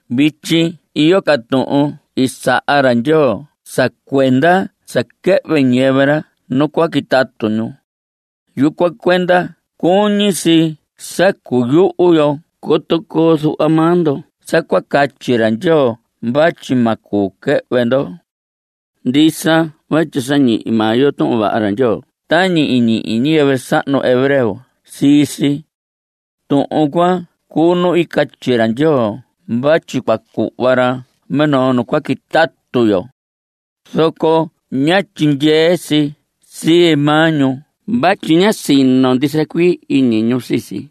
Vityi iyo ca tuhun i saha ra Ndyoo sa cuenda sa quɨhvɨ ñiyɨvɨ ra nu cua quitatu ñu. Yucuan cuenda cuñi si sa cuyuhu yo coto coo zuhva maa ndo sa cua catyi ra Ndyoo vatyi ma cuu quɨhvɨ ndo. Ndisa vatyi sa ñihi maa yo Tuhun Vaha ra Ndyoo tañi i ñihi ñiyɨvɨ sahnu hebreo sii si. (Tuhun cuan cuu nu i catyi ra Ndyoo vatyi cua cuhva ra minoo nu cua quitatu yo), zoco ñá tyindyee si sii maa ñu vatyi ñá sino ndisa cuii iñi sii si.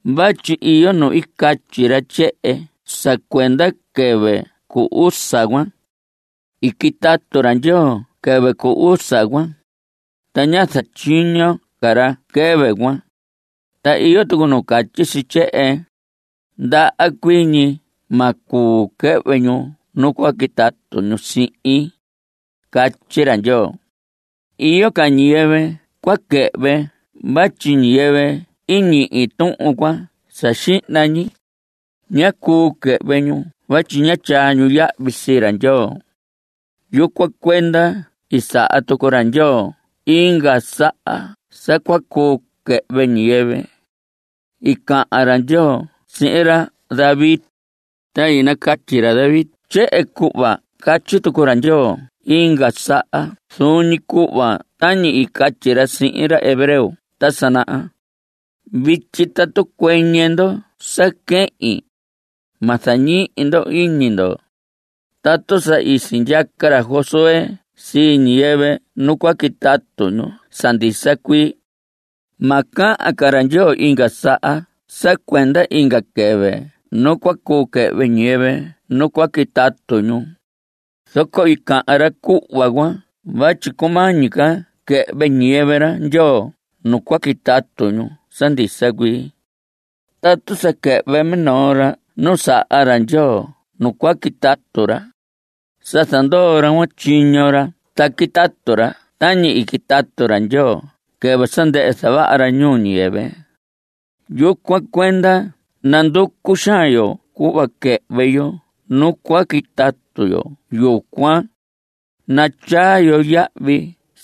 Vatyi iyo nu i catyi ra tyehen sa cuenda quɨvɨ cu usa cuan: “I quitatu ra Ndyoo quɨvɨ cu usa cuan, ta ñá zatyiño ca ra quɨvɨ cuan.” Ta iyo tucu nu catyi si tyehen: “Ndaha cuii ñi ma cuu quɨhvɨ ñu nu cua quitatu ñu sihin.” Catyi ra Ndyoo. Iyo ca ñiyɨvɨ cua quɨhvɨ vatyi ñiyɨvɨ i ñihi tuhun cuan sa xihna ñi, ñá cuu quɨhvɨ ñu vatyi ñá tyaa ñu yahvi sii ra Ndyoo. Yucuan cuenda i saha tucu ra Ndyoo inga saha sa cua cuu quɨhvɨ ñiyɨvɨ. I cahan ra Ndyoo sihin ra David, ta i nacatyi ra David tyehen, cuhva i catyi tucu ra Ndyoo inga saha zuun ñi cuhva tañi i catyi ra sihin ñiyɨvɨ hebreo ta sa naha: Vityi tatu cuɨñɨ ndo sa quehin, Ma zañihi ndo iñi ndo. Tatu sa i sindyaca ra Josué sii ñiyɨvɨ nu cua quitatu ñu sa ndisa cuii, ma cahan ca ra Ndyoo inga saha sa cuenda inga quɨvɨ nu cua cuu quɨhvɨ ñiyɨvɨ nu cua quitatu ñu. Zoco i cahan ra cuhva cuan vatyi cumañi ca quɨhvɨ ñiyɨvɨ ra Ndyoo nu cua quitatu ñu sa ndisa cuii. Tatu sa quɨhvɨ minoo ra nu saha ra Ndyoo nu cua quitatu ra, sa zandoo ra cuan tyiño ra ta quitatu ra tañi i quitatu ra Ndyoo quɨvɨ sa ndɨhɨ zavaha ra ñuu ñiyɨvɨ. Yucuan cuenda nanducu xaan yo cuhva quɨhvɨ yo nu cua quitatu yo yucuan; natyaa yo yahvi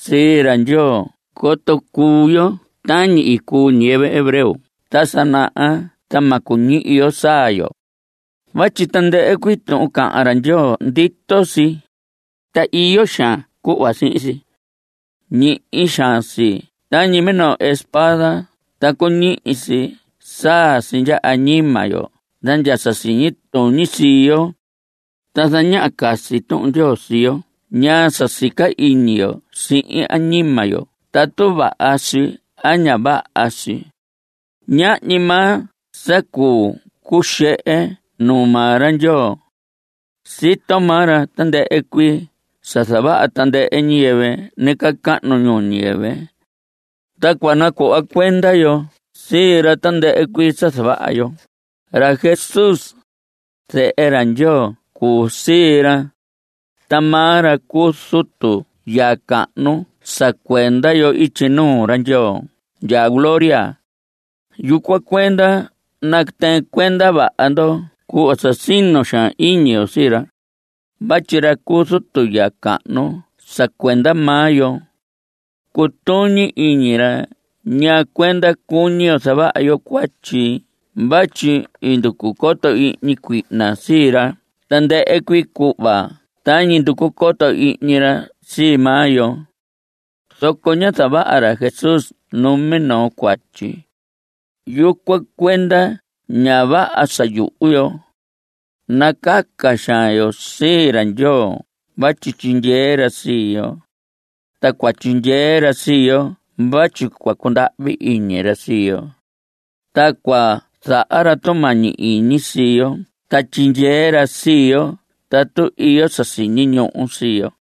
sii ra Ndyoo coto cuu yo tañi i cuu ñiyɨvɨ hebreo ta sa naha ta ma cuñihi yo saa yo. Vatyi tandɨhɨ cuii tuhun cahan ra Ndyoo, ndito si, ta iyo xaan cuhva sihin si. Ñihi xaan si tañi minoo espada ta cuñihi si saa si ndya añima yo ta ndya sa siñi tuñi sii yo. Ta zañaha casi Tuhun Ndyoo sii yo ñaa sa sica iñi yo sihin añima yo tatu vaha si a ña vaha si. Ñahñi maa sa cuu cuxehe nuu maa ra Ndyoo. Sito maa ra tandɨhɨ cuii sa zavaha tandɨhɨ ñiyɨvɨ nacahnu ñuu ñiyɨvɨ. Ta cua nacuhva cuenda yo sii ra tandɨhɨ cuii sa zavaha yo. Ra Jesús, zehe ra Ndyoo cuu sii ra, ta maa ra cuu zutu ya cahnu sa cuenda yo ityi nuu ra Ndyoo ndya gloria. Yucuan cuenda natɨɨn cuenda vaha yo cuhva sa sino xaan iñi yo sii ra. Vatyi ra cu zutu ya cahnu sa cuenda maa yo, cutuñi iñi ra ñaa cuenda cuñi yo zavaha yo cuatyi vatyi i nducu coto ihñi cuihna sii ra tandɨhɨ cuii cuhva tañi nducu coto ihñi ra sii maa yo, zoco ñá zavaha ra Jesús numinoo cuatyi. Yucuan cuenda ña vaha sa yuhu yo. Nacaca xaan yo sii ra Ndyoo vatyi tyindyee ra sii yo. Ta cua tyindyee ra sii yo vatyi cua cundahvi iñi ra sii yo, ta cua zaha ra tumañi iñi sii yo ta tyindyee ra sii yo tatu iyo sa siñi ñuhu sii yo.